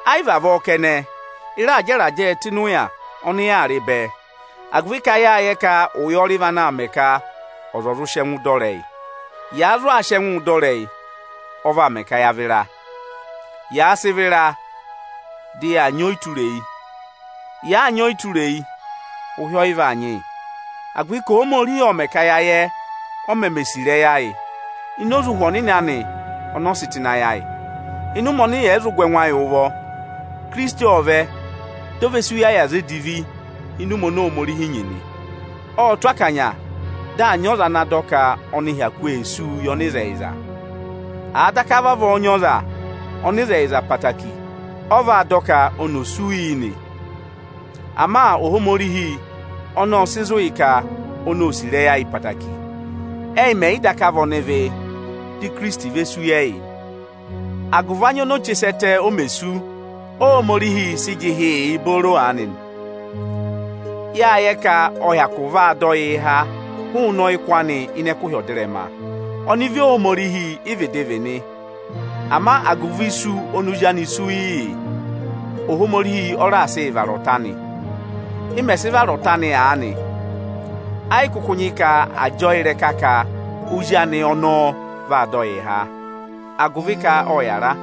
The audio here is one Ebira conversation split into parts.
Ẹ yị vavọọ kẹnẹ, ị raa jẹ ịrajẹẹ tụ́ ịnị ụya ọnị yaa rị aanị bẹẹ, agụvị ka yâ yẹ ka ụyọrị vị anaā mẹ ka ọza ọ̀ zụ sị ẹngụ dọ ịrẹyị. Yàa zụụ sị ẹngụụ dọ ịrẹyị, ọ vaa mẹ ka yaa vịra. Yàa sị vịra, dị yaa nyị ọyịtureyi. Yàa nyị ọyịtureyi, ụhị ọ yị vaa nyị yị, agụvị ka Ohomorihi ộ mẹ̀ ka ya yẹ, o meme sì ịrẹyị ayị ini oze Ụhwẹ Ohomorihi ọnị ọ sị tụ ịnị ayị ayị. Ịnị ụmẹ ọnị yẹ̀ yị zụ gụ ẹngụ ayị ụvọ, Ikirisiti ộ vẹ, di o ve sú yị ẹyị aza edivi ịnị ụmẹ oni Ohomorihi nyị nị. Ộ tụ́ akanya, dị à nyị ọza ana dọ ka ọnị hyakụ ee súu yị ọnịzẹyịza. Àa daka vavọọ nyị ọza, ọnịzẹyịza obooro ọ vaa dọ ka oni ò sú yị nị. Ama Ohomorihi ọnị ộ sị zụ ka oni ô sì ịrẹyị ayị ẹtẹẹtẹrẹ. Ẹ́yị mẹ̀ yị daka vị ọnịvị, dị Ikirisiti ve sú yị ẹyị nị. Agụvị anya oni o si che sẹ ẹtẹ o mè sú, Óhomorihi sị jị ịhị yị booro aanị nị. Yâ yẹ ka ọ hyakụ vaa dọ yịị háa hụụnị ọyịkụ anị ịnị ẹkụhị ọdịrẹma. Ọnịvị Ohomorihi ị vịdị vị nị. Ama agụvị isu oni Ozi anị sú yị yị, Ohomorihi ọ raà sị yị vara ọta anị. Ị mẹ̀ sị vara ọta anị aanị, ẹ yị kụkụ nyị ka àa jị ọọ ịrẹka ka Ozi anị ọnọọ vaa dọ yịị há, agụvị ka ộ yàra.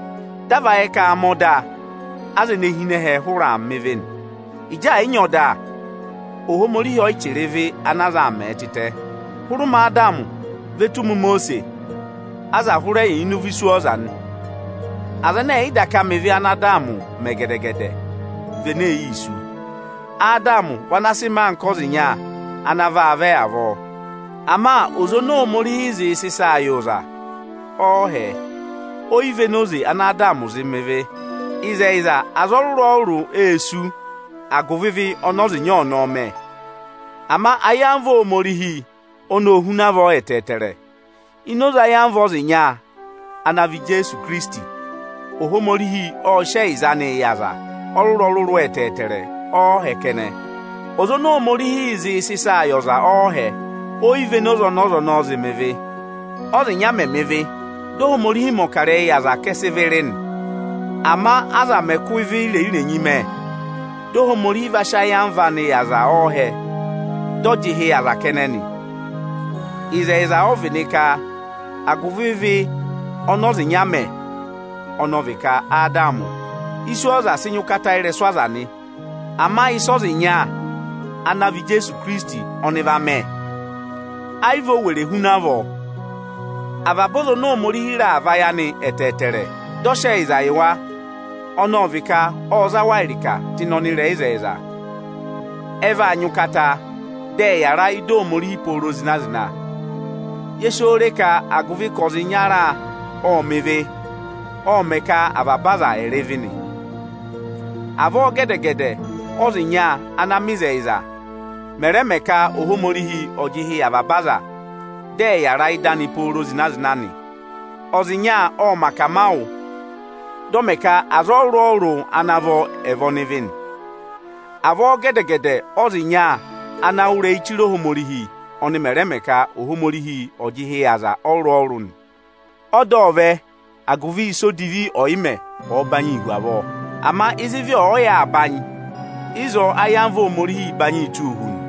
Dị a va yẹ ka aa mẹ ọda, aza ene hi ịnị ẹhẹ hụrẹ aa mẹ̀ ebira odivi nị. Ịjị ẹ̀ yị nyị ọda, Ohomorihi ọ yị chẹrẹ ịvị ana aza aa mẹ̀ẹ tịtẹ. Hụrẹ ụmẹ Adamị ve tù ụmẹ Imosiisi, aza hụrẹ yà ịnị ụvọ iswọọza nị. Aza ẹnẹ ẹ̀ yị daka mẹ ịvị ana Adamị mẹ gẹdẹ-gẹdẹ, vị ene ee yii sú. Adamị vị ana a sị mẹẹ anka Ọza ịnya ana vaa vẹ avọọ. Ama oze oni Ohomorihi zịị sị ịsaa yị ọza ọọhẹ, o yi véné oze ana Adamị zị mẹ ịvị. Ịzẹyịza, aza ọrụrụ-ọrụrụ ê sú agụvị ịvị ọnị ọza ịnya ọnọọ mẹ. Ama ayamva Ohomorihi oni ô huna avọọ ẹtẹẹtẹrẹ. Ini oze ayamva ọza ịnya ana vị Ijeesu Ikirisiti, Ohomorihi ộ sị ẹyịza anị yị aza ọrụrụ-ọrụrụ ọọhẹ kẹnẹ. Oze oni Ohomorihi zịị sị ịsa yị ọza ọọhẹ, o yi véné oze ọnị ọza zị mẹ ịvị. Ọ́za ịnya mẹ̀ mẹ ịvị, dị Ohomorihi mẹ̀ ọkarẹyị yị aza ka ẹ sị ịvị rị nị. Ama aza mẹ̀ kụ ịvị irenyi-irenyi mẹ, dị Ohomorihi va sị ayamva anị va yị aza ọọhẹ, dị ọ jị ịhị yị aza kẹnẹ nị. Ịzẹyịza ọ vị nị ka agụvị ịvị ọnị ọza ịnya mẹ, ọnị ọ vị ka Adamị, iswọọza sị nyị ụkata ịrẹsụ aza nị. Ama ịsị ọza ịnya ana vị Ijeesu Ikirisiti ọnị va mẹ, ẹ yị vị o were huna avọọ. Avaba aza oni Ohomorihi raà vayị anị ẹtẹẹtẹrẹ, dị ọ sị ẹyịza yị wa, ọnị ọ vị ka ộ za wa ịrịka tụ́ ịnị ọnịrẹyịzẹyịza, ẹ vaa nyị ụkata, dị ẹ yàra ịdị Ohomorihi pooro zịna-zịna. Ye si oo re ka agụvị ka ọza ịnyara ộ mẹ̀ ịvị, ọ mẹ̀ ka avaba aza ẹ̀ rị ịvị nị. Avọọ gẹdẹ-gẹdẹ ọ́za ịnya ana mẹ ịzẹyịza mẹ̀ rẹ mẹ ka Ohomorihi ọ̀ jị ịhị yị avaba aza, dị ẹ̀ yàra ị́dị anị pooro zịna-zịna nị. Ọza ịnya ọ mẹ akamawụ, dị ọ mẹ ka aza ọrụrụ-ọrụrụ ana vọ ẹ̀ vị ọnịvị nị. Avọọ gẹdẹ-gẹdẹ ọ́za ịnya ana wụ́ ịrẹyị chire Ohomorihi ọnị mẹ̀ rẹ mẹ ka Ohomorihi ọ̀ jị ịhị yị aza ọrụrụ-ọrụrụ nị. Ọda ộ vẹ, agụvị ịsa odivi ọ̀yị mẹ ọ̀ọ banyị hu avọọ. Ama ịzị ịvị ọ̀ọ yà aa banyị, ịzọọ áyamva Ohomorihiī banyịị tụ́ụ hu nị.